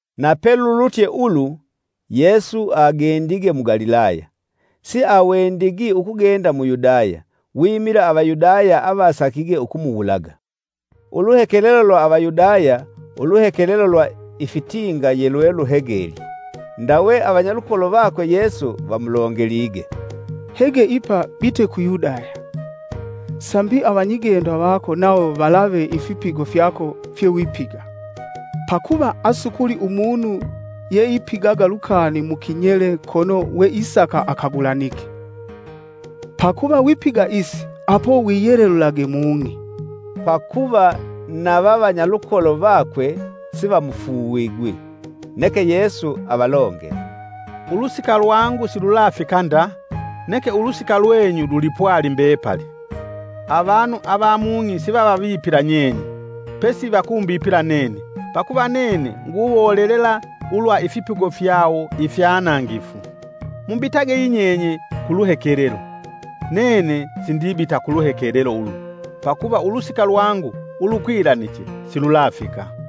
Na pelulutye ulu Yesu agendige mu Galilaya. Siawendigi ukugenda mu Yudaya, wimila Avayudaya avasakige ukumuwulaga. Uluhekelelo lwa Avayudaya, uluhekelelo lwa ifitinga yelweluhegelye. Ndawe avanyalukolo vakwe Yesu vamulongelige, “Hege ipa bite ku Yudaya, sambi avanyigendo vako nawo valave ifipigo fyako fyewipiga. Pakuva asukuli umunu yeipigaga lukani mu kinyele kono weisaka akagulanike. Pakuva wipiga isi apo wiyelelulage mung'i.” ( Pakuva na vavanyalukolo vakwe sivamufuuvigwi!) Neke Yesu avalongele, “Ulusika lwangu silulafika nda, neke ulusika lwenyu lulipwali mbepali. Avanu avamung'i sivavavipila nyenye, pesi vakumbipila nene, pakuva nene nguwolelela ulwa ifipigo fyawo ifyanangifu. Mubitage yinyenye ku luhekelelo. Nene sindibita ku luhekelelo ulu, pakuva ulusika lwangu ulukwilaniche silulafika.”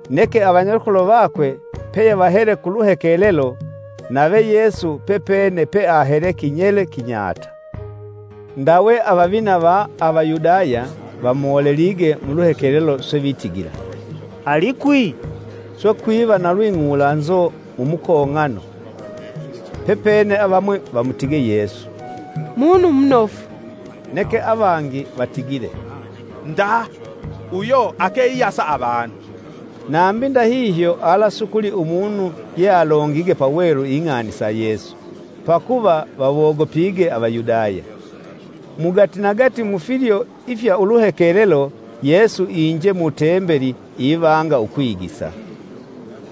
Neke avanyalukolo vakwe peyevahele ku luhekelelo, nave Yesu pepene peahele, kinyele kinyata. Ndawe avavina va Avayudaya vamolelige mu luhekelelo: swe vitigila “Alikwi?” Swe kwiva na lwing'ulanzo mumukong'ano. Pepene avamwi vamutige Yesu, “Munu munofu.” neke avangi vatigile “Nda! Uyo ake iyasa avanu.” Nambi ndahihyo alasukuli umunu yealongige pawelu ing'ani sa Yesu, pakuva vawogopige Avayudaya. Mugatinagati mufilyo ifya uluhekelelo, Yesu iinje mutembeli ivanga ukwigisa.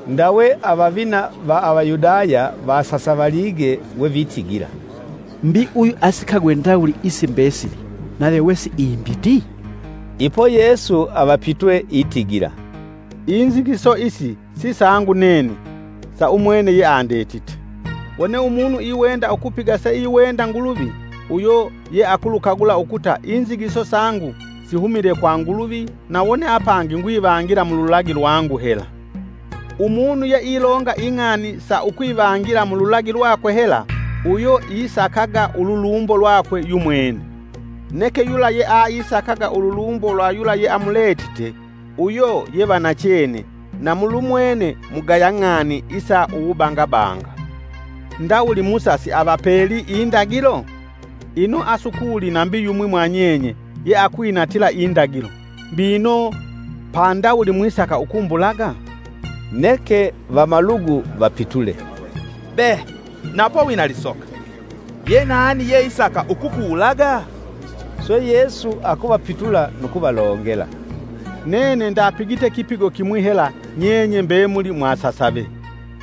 Ndawe avavina va Avayudaya vasasavalige wevitigila, “Mbi uyu asikagwe ndawuli isi mbesili nave wesiimbiti?” Ipo Yesu avapitwe itigila, “Inzigiso isi sisangu nene sa umwene yeandetite. Wone umunu iwenda ukupiga seiwenda Nguluvi uyo yealukagula ukuta inzigiso sangu sihumile kwa Nguluvi na wone apangi ngwivangila mululagi lwangu hela. Umunu yeilonga ing'ani sa ukwivangila mululagi lwakwe hela uyo isakaga ululumbo lwakwe yumwene, neke yula yeaisakaga ululumbo lwa yula yeamuletite, uyo yevanachene na mulumwene mugaya ng'ani isa uwubangabanga. Ndawuli Musa siavapelii indagilo? Ino asukuli nambi yumwi mwanyenye yeakwinatila indagilo. Mbino pandawuli mwisaka ukumbulaga?” Neke vamalugu vapitule, “Be! napo wina lisoka! Yenani yeisaka ukukuwulaga?” Swe Yesu akuvapitula nu kuvalongela, “Nene ndapigite kipigo kimwi hela nyenye mbemuli mwasasave.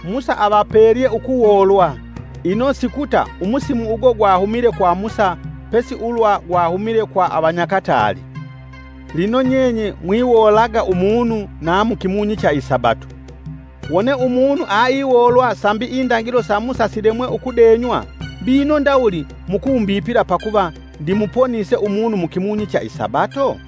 Musa avapelye ukuwoolwa ino sikuta umusimu ugo gwahumile kwa Musa pesi ulwa gwahumile kwa avanyakataali. Lino nyenye mwiwoolaga umunu na mukimunyi cha isabato. Wone umunu aiwoolwa sambi indagilo sa Musa silemwe ukudenywa mbino ndawuli mukumbipila pakuva ndimuponise umunu mukimunyi cha isabato?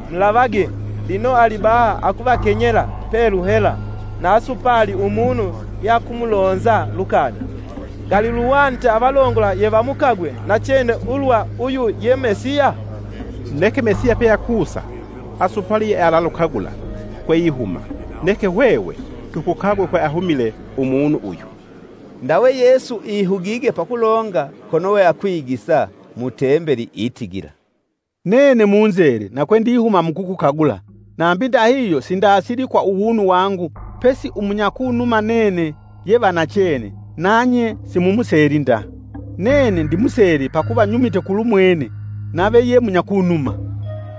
Mulavage! lino alibaha akuvakenyela pelu hela na asupali umunu yeakumulonza lukani. Ngali luhwanite avalongola yevamukagwe nachene ulwa uyu, ye Mesiya? Neke Mesiya peakusa asupali yealakukagula kweihuma, neke hwehwe tukukagwe kweahumile umunu uyu!” Ndawe Yesu ihugige pakulonga kono we akwigisa, mu Tembeli itigila, “Nene munzele na kwendihuma mukukukagula nambi ndahihyo sindasili kwa uwunu wangu pesi umunyakunuma nene ye va nachene nanye simumuseli nda. Nene ndimusele pakuva nyumite kulumwene nave ye munyakunuma.”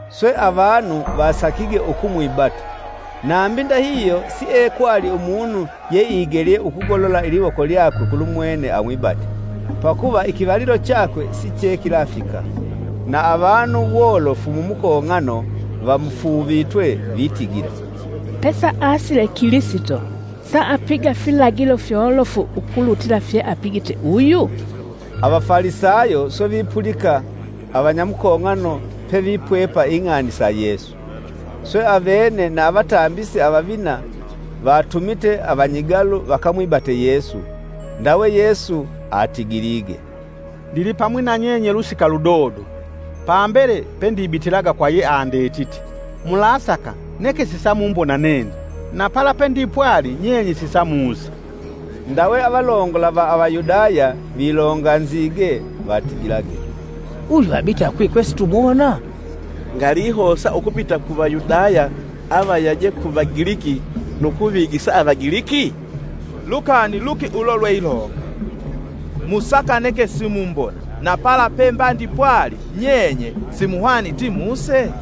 Swe avanu vasakige ukumwibata, nambi ndahihyo siekwali umunu yeigelye ukugolola iliwoko lyakwe kulumwene amwibate, pakuva ikivalilo chakwe sichekilafika. na avanu wolofu mumukong'ano vamufuuvitwe vitigila, “Pesaasile Kilisito saapiga filagilo fyolofu ukulutila fye apigite uyu?” Avafalisayo swe vipulika avanyamukong'ano pevipwepa ing'ani sa Yesu. Swe, avene na avatambisi avavina vatumite avanyigalu vakamwibate Yesu. Ndawe Yesu atigilige, “Ndilipamwi na nyenye lusika ludodo, pambele pe ndibitilaga kwa yeandetite. Mulasaka neke sisamumbona nene, na pala pendipwali nyenye sisamusa.” Ndawe avalongola va Avayudaya vilonganzige vatigilage, “Uyu abita kwi kwesitumuwona? Ngalihosa ukubita ku Vayudaya avayaje ku Vagiliki nu kuvigisa Avagiliki? Lukani luki ulo lweilonga: ‘Musaka neke simumbona na pala pemba ndipwali nyenye simuhwaniti muse?’”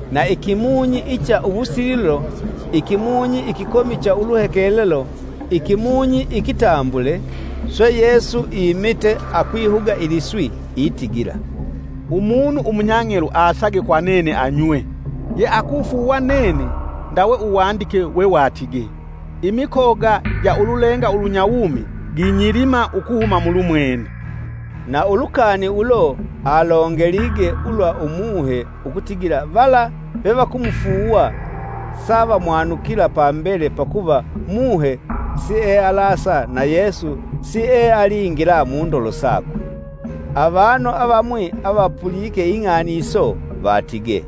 Na ikimunyi icha uwusililo, ikimunyi ikikomi cha uluhekelelo, ikimunyi ikitambule swe Yesu imite akwihuga iliswi itigila, “Umunu umunyang'elu asage kwa nene anywe. Yeakufuuwa nene, ndawe uwandike wewatige: ‘Imikoga ja ululenga ulunyawumi, ginyilima ukuhuma mulumwene!’” ( Na ulukani ulo alongelige ulwa Umuhe, ukutigila vala vevakumufuuwa savamwanukila pambele pakuva Muhe sielasa na Yesu siealingila mundolo sakwe.) Avanu avamwi avapulike ing'ani iso vatige,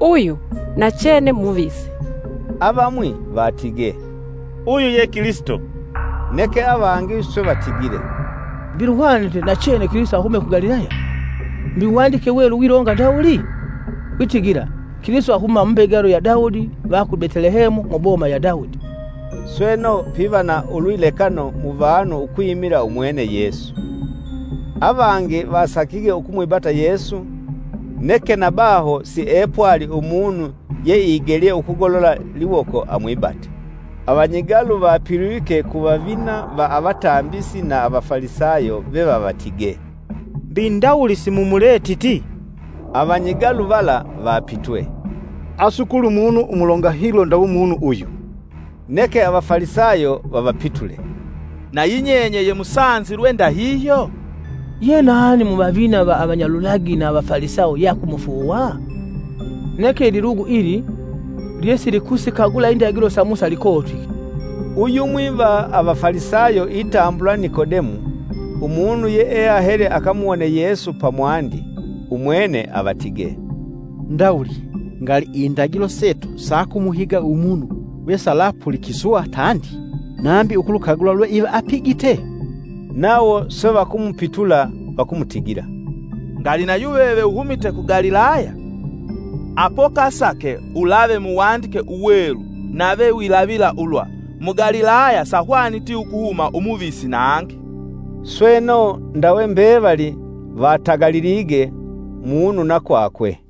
“Uyu nachene muvisi!” Avamwi vatige, “Uyu ye Kilisito!” Neke avangi swe vatigile, “Mbi luhwanite nachene Kilisito ahume ku Galilaya? Mbi uwandike Uwelu wilonga ndawuli? Witigila, ‘Kilisito ahuma mumbegalo ya Daudi va ku Betelehemu, muboma ya Daudi!’” Sweno, piva na ulwilekano muvanu ukwimila umwene Yesu. Avangi vasakige ukumwibata Yesu, neke na baho siepwali umunu yeigelye ukugolola liwoko amwibata. Avanyigalu vapilwike, ku vavina va avatambisi na Avafalisayo vevavatige, “Mbi ndawuli simumuletiti?” Avanyigalu vala vapitwe, “Asukuli umunu umulonga hilo ndawe umunu uyu!” “Neke Avafalisayo vavapitule nayi nyenye ye musanzilwe ndahihyo? Yenani muvavina na avanyalulagi na Avafalisayo yeakumufuuwa? Neke ililugu ili, lyesilikulukagula ululagilo sa Musa likotwike!” Uyumwi va Avafalisayo itambulwa Nikodemu, umunu yeahele akamuwone Yesu pamwandi. Umwene avatige, “Ndawuli ngali ndagilo setu sakumuhiga umunu wesalapulikiswa tandi, nambi ukulukagula lweiva apigite?” Nawo swe vakumupitula vakumutigila, “Ngali nayuveve uhumite ku Galilaya? Apo kasake ulave muwandike uwelu nave wilavila ulwa, Mu Galilaya sahwaniti ukuhuma umuvisi nangi!” [ Sweno, ndawe mbevali vatagalilige, munu na kwakwe.]